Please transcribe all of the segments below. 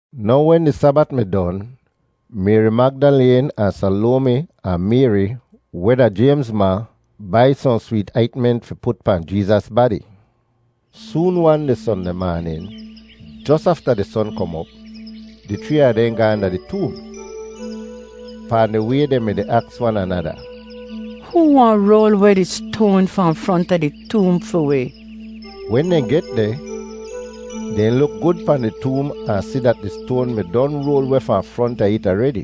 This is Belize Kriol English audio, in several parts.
Now wen di Sabat mi don, Mayri Magdaleen ahn Salomi ahn Mayri, weh da Jaymz ma, bai sohn sweet aintment fi put pahn Jeezas badi. Soon-wan di Sondeh maanin, jos afta di son kom op, di chree a dehn gaahn da di toom. Pahn di way dehn mi-di aks wan anada, “Hoo wahn roal weh di stoan fahn fronta di toom fi wi?” Wen dehn get deh, dehn luk gud pahn di toom ahn si dat di stoan mi don roal weh fahn fronta it aredi!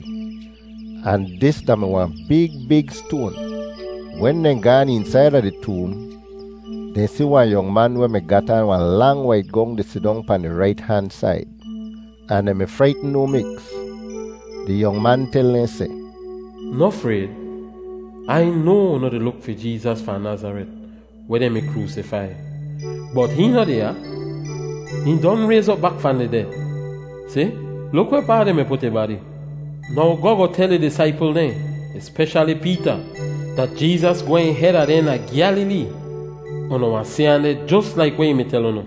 Ahn dis da-mi wahn big big stoan! Wen dehn gaan eensaida di toom, dehn si wahn yong man weh mi gat aan wahn lang wait gong di sidong pahn di rait han said, ahn dehn mi fraitn no miks! Di yong man tel dehn seh, “Noh frayd! Ai noa unu di luk fi Jeezas fahn Nazaret weh dehn mi kroosifai, bot hihn noh deh ya; hihn don rayz op bak fahn di ded! Si, luk wehpaa dehn mi put ih badi. Now goh goh tel ih disaipl dehn, espeshali Peeta, dat Jeezas gwehn heda dehn da Gyalilee. Unu wahn si ahn deh jos laik weh ih mi tel unu.”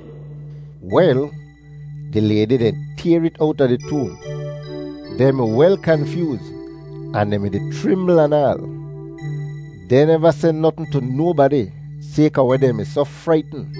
Wel, di laydi dehn tayr it owta di toom. Dehn mi wel kanfyooz ahn dehn mi-di chrimbl anaal. Dehn neva seh notn tu nobadi, sayka weh dehn mi soh fraitn.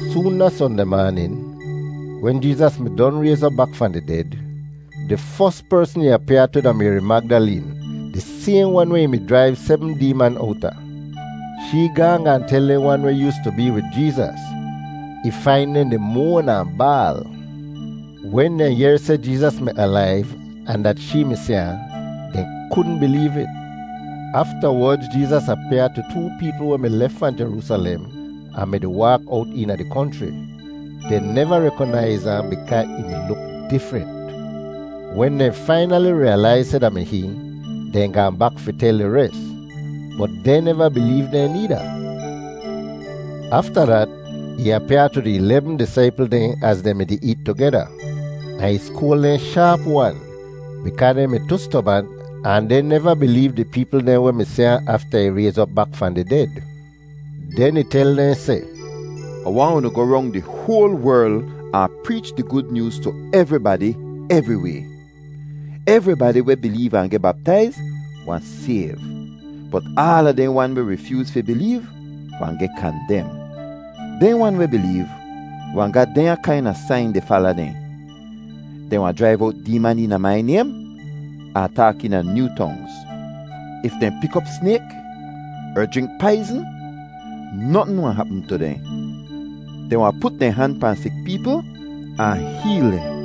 [Soon da Sondeh maanin, wen Jeezas mi don rayz op bak fahn di ded, di fos persn ih apyaa tu da Mayri Magdaleen, di sayhn wan weh ih mi jraiv sebm deeman owta. Shee gaahn gaahn tel dehn wan weh yoostu bee wid Jeezas. Ih fain dehn di moan ahn baal. Wen dehn yehr seh Jeezas mi alaiv ahn dat shee mi si ahn, dehn kudn bileev it. Aftawodz Jeezas apyaa tu too peepl weh mi lef fahn Jeroosalem ahn mi-di waak owt eena di konchri. Dehn neva rekonaiz ahn bikaa ih mi luk difrent. Wen dehn fainali riyalaiz seh da mi hihn, dehn gaahn bak fi tel di res, bot dehn neva bileev dehn needa. Afta dat, ih apyaa tu di ilebm disaipl dehn az dehn mi-di eet tugeda. Ahn ih skoal dehn shaap-wan bikaa dehn mi tu stobant ahn dehn neva bileev di peepl dehn weh mi si ahn afta ih rayz op bak fahn di ded. Den ih tel dehn seh, “Ah waahn unu goh rong di hoal werl ahn preech di Gud Nyooz tu evribadi evriway. Evribadi weh bileev ahn geh baptaiz wahn sayv. Bot aala dehn wan weh rifyooz fi bileev wahn geh kandem. Dehn wan weh bileev wahn ga dehnya kaina sain di fala dehn: Dehn wahn jraiv owt deeman eena mai naym ahn taak eena nyoo tongz. If dehn pik op snayk er jrink paizn, notn wahn hapm tu dehn. Dehn wahn put dehn han pahn sik peepl ahn heel dehn.”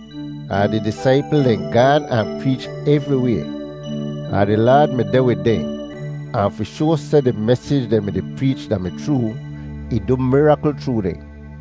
Ahn di disaipl dehn gaan ahn preech evriway. Ahn di Laad mi deh wid dehn, ahn fi shoa seh di mesij dehn mi-di preech da-mi chroo, ih du mirakl chroo dehn.]